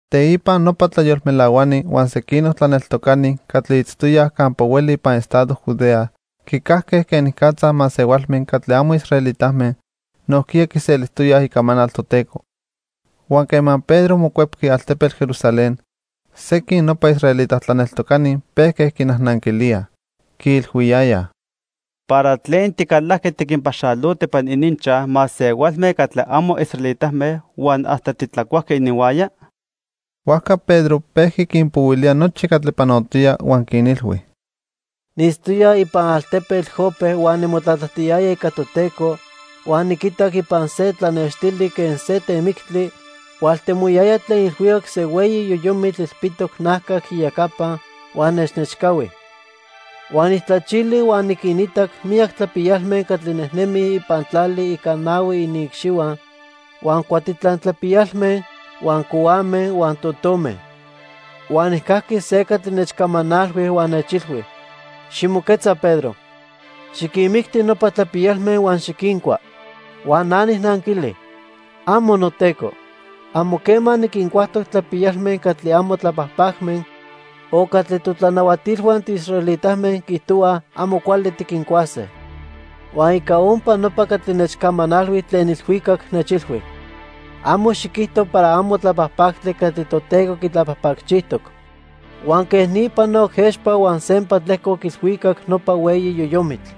Teipa nopa tlayolmelahuani huan sequinoc tlaneltocani catli itztoyaj campa hueli ipan estado Judea quicajque quenicatza masehualme catli amo israelitame nojquiya quiselijtoyaj icamanal Toteco. Huan quema Pedro mocuepqui altepetl Jerusalén, sequin nopa israelita tlaneltocani pejque quinajnanquilíaj. Quiilhuiyayaj: —¿Para tlen ticalajqui tiquinpaxaloto ipan ininchaj masehualme catli amo israelitame huan hasta titlacuajqui ininhuaya? Huajca Pedro pejqui quinpohuilía nochi catli panotoya huan quinilhui: —Niitztoya ipan altepetl Jope huan nimotlatlajtiyaya ica Toteco huan niquitac ipan se tlanextili quen se temictli, hualtemoyaya tlen ilhuicac se hueyi yoyomitl ilpitoc najcac iyecapa huan nechnechcahui. Huan nijtlachili huan niquinitac miyac tlapiyalme catli nejnemij ipan tlali ica nahui iniicxihua, huan cuatitlan tlapiyalme, huan cohuame huan totome. Huan nijcajqui se catli nechcamanalhui huan nechilhui: 'Ximoquetza Pedro, xiquinmicti nopa tlapiyalme huan xiquincua.' "Huan na nijnanquili: '¡Amo, noTeco! Amo quema niquincuajtoc tlapiyalme catli amo tlapajpacme o catli totlanahuatilhua tiisraelitame quiijtohuaj amo cuali tiquincuase.' "Huan ica ompa nopa catli nechcamanalhui tlen ilhuicac nechilhui: 'Amo xiquijto para amo tlapajpactli catli Toteco quitlapajpacchijtoc.' Huan quej ni panoc expa huan sempa tlejcoc ilhuicac nopa hueyi yoyomitl.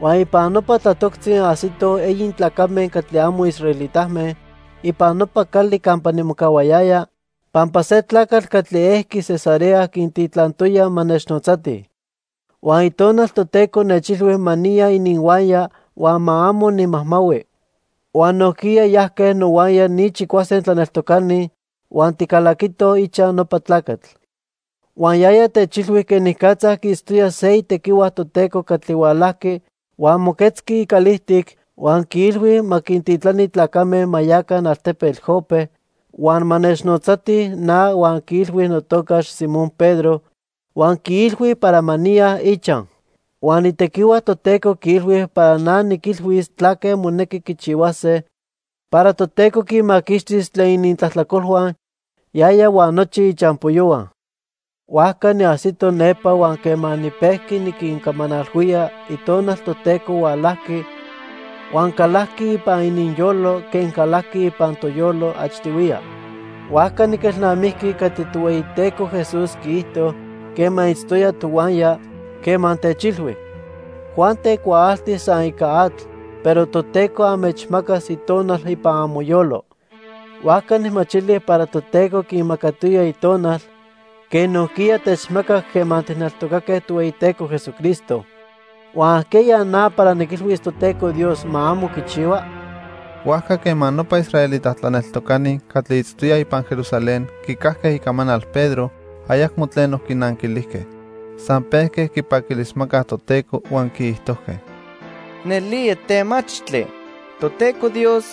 "Huan ipan nopa tlatoctzi ajsitoj eyi tlacame catli amo israelitame ipan nopa cali campa nimocahuayaya pampa se tlacatl catli ejqui Cesarea quintitlantoya ma nechnotzatij. Huan Itonal Toteco nechilhui ma niya ininhuaya huan ma amo nimajmahui. Huan nojquiya yajque nohuaya ni chicuase tlaneltocani huan ticalaquitoj ichaj nopa tlacatl. Huan yaya techilhui quenicatza quiitztoya se itequihua Toteco catli hualajqui huan moquetzqui icalijtic huan quiilhui ma quintitlani tlacame ma yaca altepetl Jope, huan ma nechnotzatij na huan quiilhui notocax Simón Pedro huan quiilhui para ma niya ichaj. Huan itequihua Toteco quiilhui para na niquilhuis tlaque monequi quichihuase para Toteco quinmaquixtis tlen inintlajtlacolhua, yaya huan nochi ichampoyohua. "Huajca niajsito nepa huan quema nipejqui niquincamanalhuía, Itonal Toteco hualajqui, huan calajqui ipan ininyolo quen calajqui ipan toyolo achtihuiya. Huajca niquelnamijqui catli Tohueyiteco Jesús quiijto quema itztoya tohuaya, quema techilhui: 'Juan tecuaalti san ica atl, pero Toteco anmechmacas Itonal ipan amoyolo.' Huajca nijmachili para Toteco quinmacatoya Itonal quen nojquiya techmacac quema tijneltocaque Tohueyiteco Jesucristo. Huan ¿ajqueya na para niquilhuis Toteco Dios ma amo quichihua?" Huajca quema nopa israelita tlaneltocani catli itztoyaj ipan Jerusalén quicajque icamanal Pedro, ayacmo tleno quinanquilijque. San pejque quipaquilismacaj Toteco huan quiijtojque: —Nelía temachtli Toteco Dios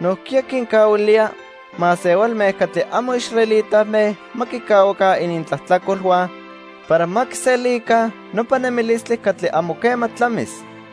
nojquiya quincahuilía masehualme catli amo israelitame ma quicahuaca inintlajtlacolhua para ma quiselica nopa nemilistli catli amo quema tlamis.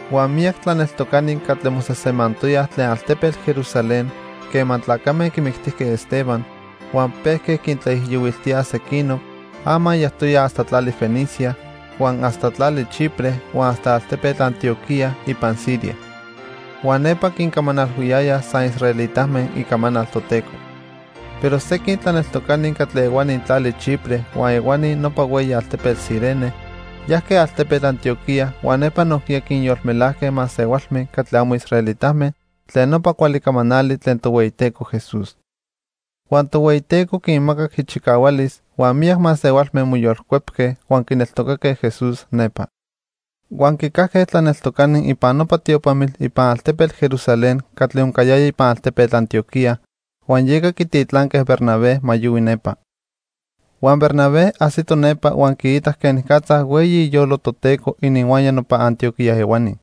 Huan miyac tlaneltocani catli mosejsemantoyaj tlen altepetl Jerusalén quema tlacame quimictijque Esteban huan pejque quintlaijiyohuiltíaj sequinoc, ama yajtoyaj hasta tlali Fenicia, huan hasta tlali Chipre huan hasta altepetl Antioquía ipan Siria. Huan nepa quincamanalhuiyayaj san israelitame icamanal Toteco. Pero sequin tlaneltocani catli ehuani tlali Chipre huan ehuani nopa hueyi altepetl Cirene, yajque altepetl Antioquía huan nepa nojquiya quinyolmelajque masehualme catli amo israelitame tlen nopa cuali camanali tlen Tohueyiteco Jesús. Huan Tohueyiteco quinmacac ichicahualis, huan miyac masehualme moyolcuepque huan quineltocaque Jesús nepa. Huan quicajque tlaneltocani ipan nopa tiopamitl ipan altepetl Jerusalén catli oncayaya ipan altepetl Antioquía, huan yeca quititlanque Bernabé ma yohui nepa. Huan Bernabé ajsito nepa huan quiitac quenicatza hueyi iyolo Toteco ininhuaya nopa Antioquía ehuani.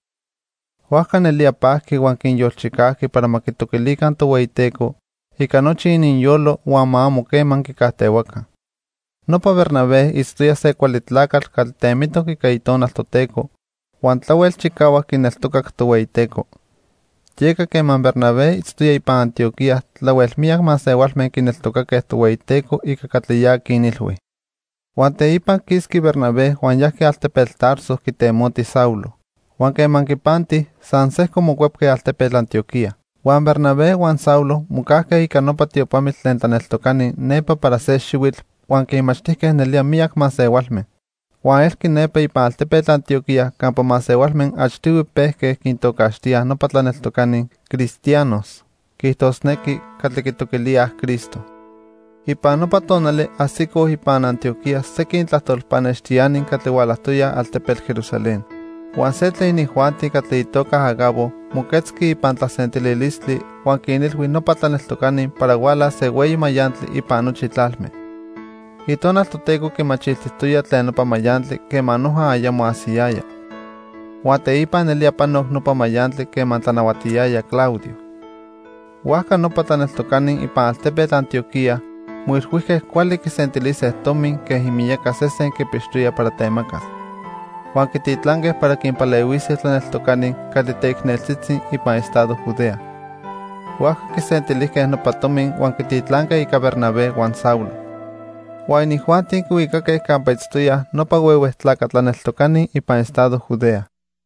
Huajca nelía pajqui huan quinyolchicajqui para ma quitoquilica Tohueyiteco ica nochi ininyolo huan ma amo quema quicajtehuaca. Nopa Bernabé itztoya se cuali tlacatl catli temitoc ica Itonal Toteco huan tlahuel chicahuac quineltocac Tohueyiteco. Yeca quema Bernabé itztoya ipan Antioquía tlahuel miyac masehualme quineltocaque Tohueyiteco ica catli ya quinilhui. Huan teipa quisqui Bernabé huan yajqui altepetl Tarso quitemoti Saulo. Huan quema quipanti, san sejco mocuepque altepetl Antioquía. Huan Bernabé huan Saulo mocajque ica nopa tiopamitl tlen tlaneltocani nepa para se xihuitl huan quinmachtijque nelía miyac masehualme. Huan elqui nepa ipan altepetl Antioquía campa masehualme achtihui pejque quintocaxtíaj nopa tlaneltocani "cristianos", quiijtosnequi, catli quitoquilíaj Cristo. Ipan nopa tonali ajsicoj ipan Antioquía sequin tlajtol pannextiani catli hualajtoyaj altepetl Jerusalén. Huan se tlen inijuanti catli itoca Agabo moquetzqui ipan tlasentililistli huan quinilhui nopa tlaneltocani para hualas se hueyi mayantli ipan nochi tlalme. Itonal Toteco quimachiltijtoya tlen nopa mayantli quema noja ayamo ajsiyaya. Huan teipa nelía panoc nopa mayantli quema tlanahuatiyaya Claudio. Huajca nopa tlaneltocani ipan altepetl Antioquía moilhuijque cuali quisentilise tomi quen imiyaca sesen quipixtoyaj para temacas. Huan quititlanque para quinpalehuise tlaneltocani catli teicneltzitzi ipan estado Judea. Huajca quisentilijque nopa tomi huan quititlanque ica Bernabé huan Saulo. Huan inijuanti quihuicaque campa itztoyaj nopa huehue tlaca tlaneltocani ipan estado Judea.